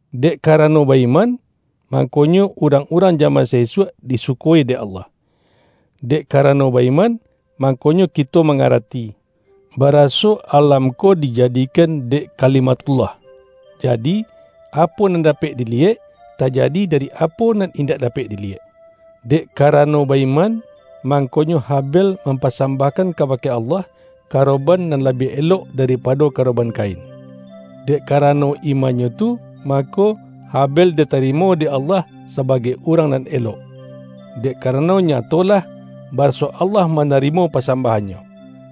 Dek karano ba-iman, mangkonyo urang-urang jaman sa-isuak disuko-i dek Allah. Dek karano ba-iman, mangkonyo kito mangarati, baraso alam ko dijadi-kan dek Kalimathullah; jadi, apo nan dapek diliyek, tajadi dari apo nan in-dak dapek diliyek. Dek karano ba-iman, mangko-nyo Habel mampasambahkan kaba-ke Allah, karoban nan labiah elok daripado karoban Kain. Dek karano imannyo tu, mako, Habel ditarimo dek Allah sabagai urang nan elok, dek karano nyatolah, baraso Allah mana-rimo pasambahannyo.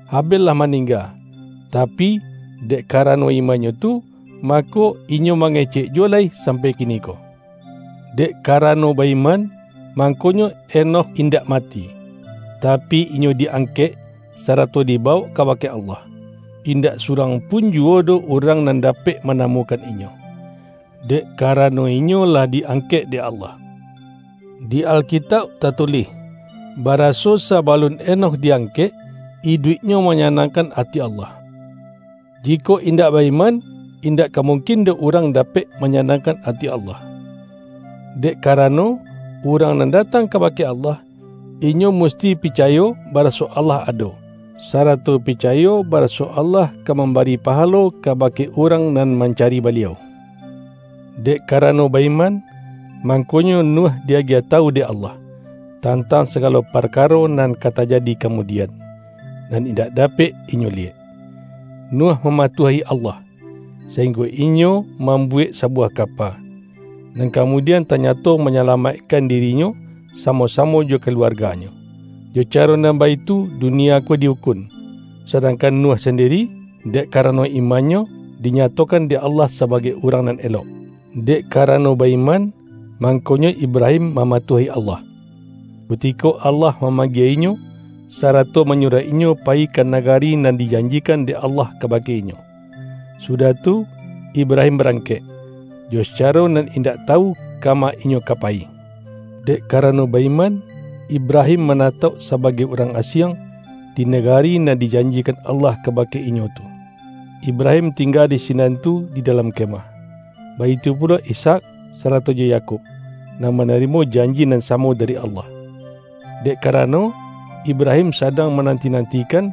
Habel lah ma-ningga, tapi, dek karano imannyo tu, mako, inyo mangecek juwo lai sam-pai kiniko. Dek karano ba-iman, mangkonyo Henokh indak mati, tapi inyo di-ang-kek, sarato dibawok kabake Allah. In-dak surang pun juwo doh urang nan dapek manamukan inyo, dek kara-no inyo lah di-angkek dek Allah. Di Alkitauk tatulih, baraso sabalun He-nokh di-angkek, iduiknyo manya-nangkan ati Allah. Jikok indak ba-iman, indak ka mungkin doh urang dapek manyanangkan ati Allah. Dek karano, urang nan datang kaba-ke Allah, inyo musti picayo baraso Allah ado, sarato picayo baraso Allah ka mambari pahalo kabake urang nan mancari Baliau. Dek karano ba-iman, mangkonyo Nuh di-agiah tawu dek Allah, tantang sagalo parkaro nan ka tajadi kamudi-an, nan indak dapek inyo liyek. Nuh mamatuahi Allah, sainggo inyo mam-buwek sabuwah kapa, nan kamudian tanyato manyalamaikkan dirinyo sa-mo-samo jo kaluarganyo. Jo caro nan baitu dunia ko di-ukun, sadangkan Nuh sandiri, dek karano imannyo, dinyatokan dek Allah sabagai urang nan elok. Dek karano ba-iman, mangko-nyo Ibrahim mamatuahi Allah, ku-tiko Allah mamanggie inyo, sarato manyuruah inyo payi ka nagari nan dijanjikan dek Allah kabake inyo. Su-dah tu, Ibrahim barangkek, jo sacaro nan indak tawu kama inyo ka payi. Dek karano ba-iman, Ibrahim mana-tauk sabagai urang asiang, di nagari nan dijanjikan Allah kabake inyo tu. Ibrahim tingga di sinan tu di dalam kemah. Baitu pulo Ishak, sarato jo Yakub, nan manarimo janji nan samo dari Allah. Dek karano, Ibrahim sa-dang mananti-nantikan,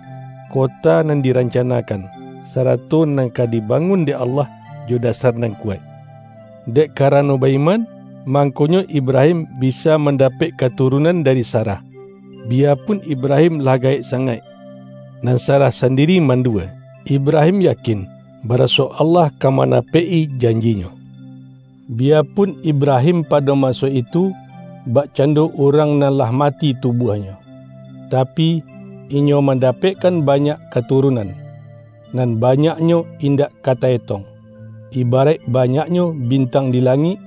kota nan di-rancanakan, sarato nan ka dibangun dek Allah jo dasar nan kuwaik. Dek karano ba-iman, mangkonyo Ibrahim bisa mandapek katurunan dari Sarah, biyapun Ibrahim lah gaek sangaik, nan Sarah sandiri mandua. Ibrahim yakin, baraso Allah ka ma-napek-i janji-Nyo. Biyapun Ibrahim pado maso itu, bakcando urang nan lah mati tubuahnyo, tapi, inyo man-dapekkan banyak katurunan, nan ba-nyaknyo indak ka ta-etong — ibaraik banyaknyo bintang di langik,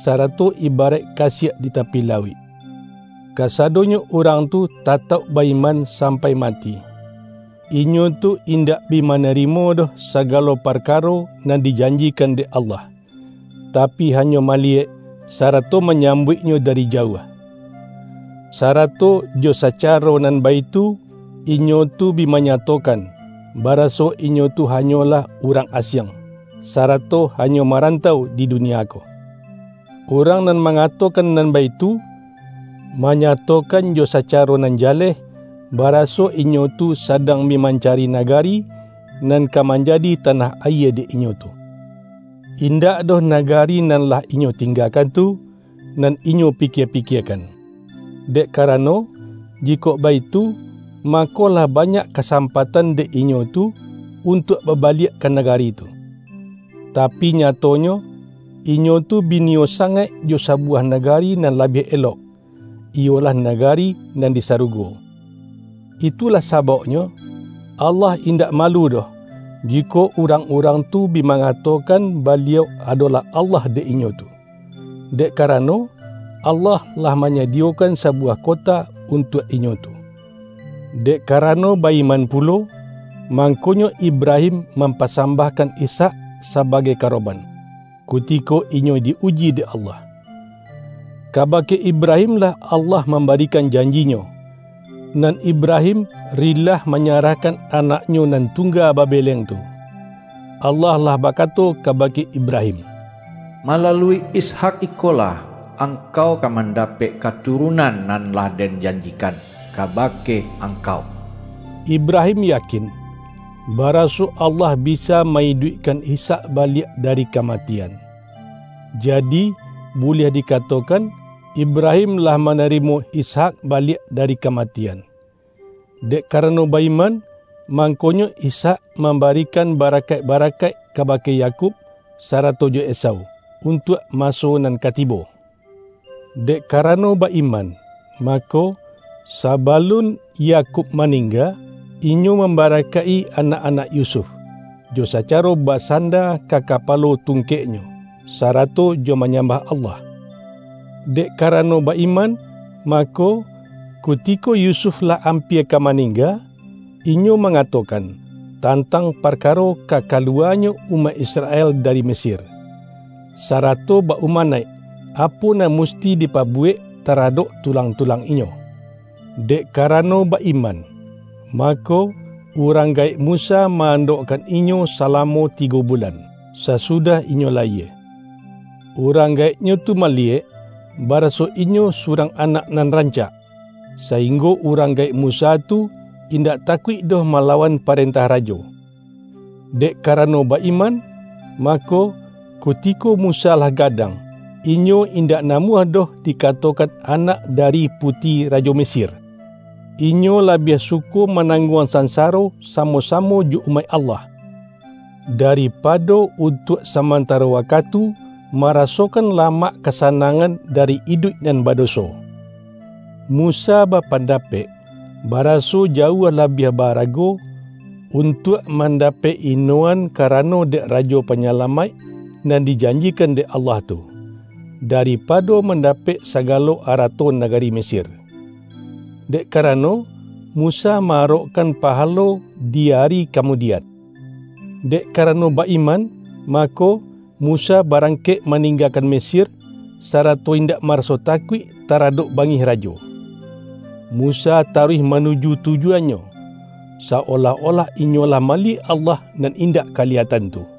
sarato ibaraik kasiak di tapi lauik. Kasadonyo urang tu tatauk ba-iman sampai mati. Inyo tu indak bi manarimo doh sagalo parkaro nan di-janjikan dek Allah, tapi hanyo mali-yek, sarato manyambuiknyo dari ja-uah. Sarato jo sacaro nan baitu, inyo tu bi manyatokan, baraso inyo tu ha-nyolah urang asiang, sarato hanyo marantau di dunia ko. Urang nan mangatokan nan baitu, manyatokan jo sacaro nan jaleh, baraso inyo tu sadang bi mancari nagari, nan ka man-jadi tanah ayie dek inyo tu. Indak doh nagari nan lah inyo tinggakan tu, nan inyo pikie-pikiekan. Dek karano, jikok baitu, mako lah banyak kasam-patan dek inyo tu, untuak babaliak ka nagari tu. Tapi nyatonyo, inyo tu bi niyo sangaik jo sabuwah nagari nan labiah elok, iyolah nagari nan di saru-go. Itulah sabauknyo, Allah indak ma-lu doh, jikok urang-urang tu bi manga-tokan Baliau adolah Allah dek inyo tu, dek karano, Allah lah manyadiyokan sabuwah kota untuak inyo tu. Dek karano ba-iman pulo, mang-konyo Ibrahim mampasambahkan Ishak sabagai karoban, kutiko inyo di-uji dek Allah. Kabake Ibrahim-lah Allah mambarikan janji-Nyo, nan Ibrahim rilah manyarahkan anaknyo nan tungga babeleng tu. Allah lah bakato kabake Ibrahim,”Malalui Is-hak ikolah, angkau ka mandapek ka-turunan nan lah Den janjikan kaba-ke angkau.” Ibrahim yakin, baraso Allah bisa ma-iduikkan Ishak baliak dari kamatian — jadi, buliah dikato-kan, Ibrahim lah manarimo Ishak ba-liak dari kamatian. Dek karano ba-iman, mangkonyo Ishak mambarikan barakaik-barakaik kabake Yakub, sarato jo Esau, untuak maso nan ka tibo. Dek karano ba-iman, mako, saba-lun Yakub maningga, inyo mambara-kaik-i anak-anak Yusuf —jo sacaro ba-sanda ka kapalo tungkeknyo, sarato jo manyambah Allah. Dek karano ba-iman, mako, ku-tiko Yusuf lah ampia ka maningga — inyo mangatokan, tantang parkaro ka kaluwanyo umaik Israel dari Mesir, sa-rato ba-umanaik, apo nan musti dipa-buwek taradok tulang-tulang inyo. Dek karano ba-iman, mako, urang gaek Musa ma-andokkan inyo salamo tigo bulan, sasudah inyo layie. Urang gaeknyo tu maliyek, baraso inyo su-rang anak nan rancak, sainggo urang gaek Musa tu, indak takuik doh ma-lawan parentah rajo. Dek karano ba-iman, mako, kuti-ko Musa lah gadang, inyo indak na-muah doh dikatokan anak dari puti rajo Mesir. Inyo labiah suko ma-nangguang sansaro samo-samo jo umaik Allah, daripado untuak saman-taro wakatu, marasokan lamak kasa-nangan dari iduik nan badoso. Musa bapandapek, baraso jauah labiah ba-arago, untuak mandapek inoan kara-no dek Rajo Panyalamaik, nan dijanji-kan dek Allah tu, daripado mandapek sagalo arato nagari Mesir. Dek kara-no, Musa ma-arokkan pahalo di ari ka-mudian. Dek karano ba-iman, mako, Musa barangkek maninggakan Mesir, sarato indak maraso takuik taradok bangih rajo. Musa taruih manuju tujuannyo, sa-olah-olah inyo lah maliyek Allah nan indak kaliyatan tu.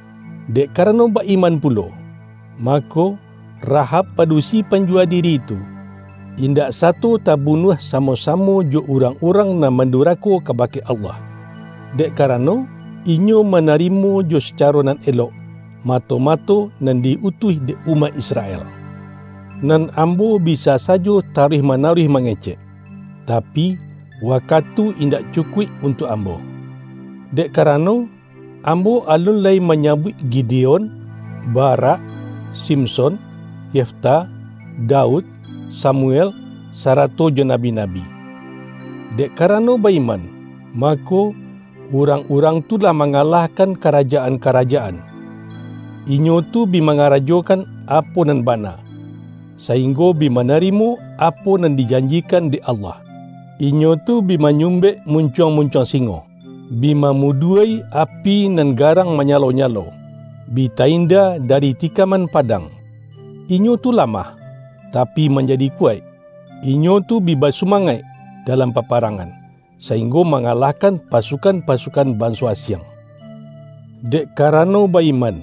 Dek karano ba-iman pulo, mako, Rahab padusi panjuwa diri tu, indak sato tabunuah samo-samo jo urangurang nan mandurako kabake Allah; dek karano, inyo manarimo jo sacaro nan elok, mato-mato nan di-utuih dek umaik Israel. Nan ambo bisa sajo taruih mana-ruih mangecek, tapi, wakatu indak cu-kuik untuak ambo. Dek karano, am-bo alun lai manyabuik Gideon, Barak, Simson, Yefta, Daud, Samuel, sarato jo nabi-nabi. Dek karano ba-iman, ma-ko, urang-urang tu lah mangalahkan karajaan-karajaan. Inyo tu bi manga-rajokan apo nan bana, sainggo bi ma-narimo apo nan dijanjikan dek Allah. Inyo tu bi manyumbek muncuang-muncuang singo, bi mamudua-i api nan garang manyalo-nyalo, bi ta-inda dari tikaman padang. Inyo tu lamah, tapi manjadi kuwaik; inyo tu bi basu-mangaik dalam paparangan, sainggo mangalahkan pasukan-pasukan banso asiang. Dek karano ba-iman,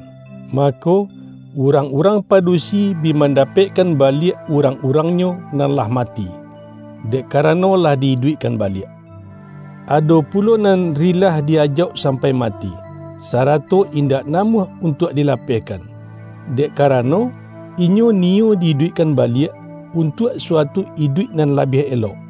mako, urang-urang padusi bi mandapekkan baliak urang-urangnyo nan lah mati, dek karano lah di-iduikkan baliak. Ado pulo nan rilah di-ajauk sampai mati, sarato indak namuah untuak di-lapehkan, dek karano, inyo niyo di-iduikkan baliak, untuak suatu iduik nan labiah elok.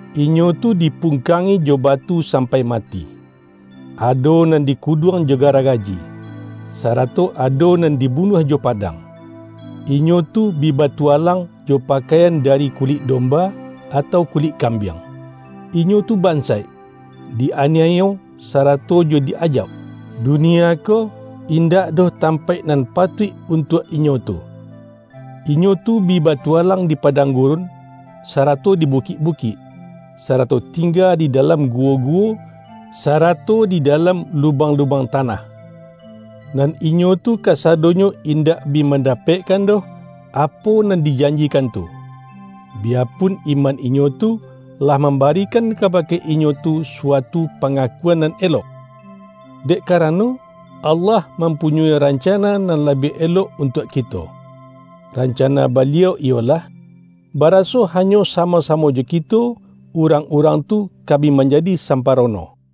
Inyo tu dipungkangi jo batu sampai mati, ado nan dikuduang jo garagaji, sara-to ado nan dibunuah jo padang. Inyo tu bi batualang jo pakaian dari kulik domba, atau kulik kambiang; inyo tu bansaik, di-aniayo sarato jo di-ajauk. Dunia ko, indak doh tampaik nan patuik untuak inyo tu. Inyo tu bi ba-tualang di padang gurun, sarato di bukik-bukik, sarato tingga di dalam guwo-guwo, sarato di dalam lubang-lubang tanah. Nan inyo tu kasadonyo indak bi mandapekkan doh, apo nan dijanjikan tu, biyapun iman inyo tu, lah mamba-rikan kabake inyo tu suatu pangakuan nan elok. Dek karano, Allah mampu-nyoi rancana nan labiah elok untuak kito. Rancana Baliau iyolah, baraso hanyo samo-samo jo kito, urang-urang tu ka bi manjadi samparono.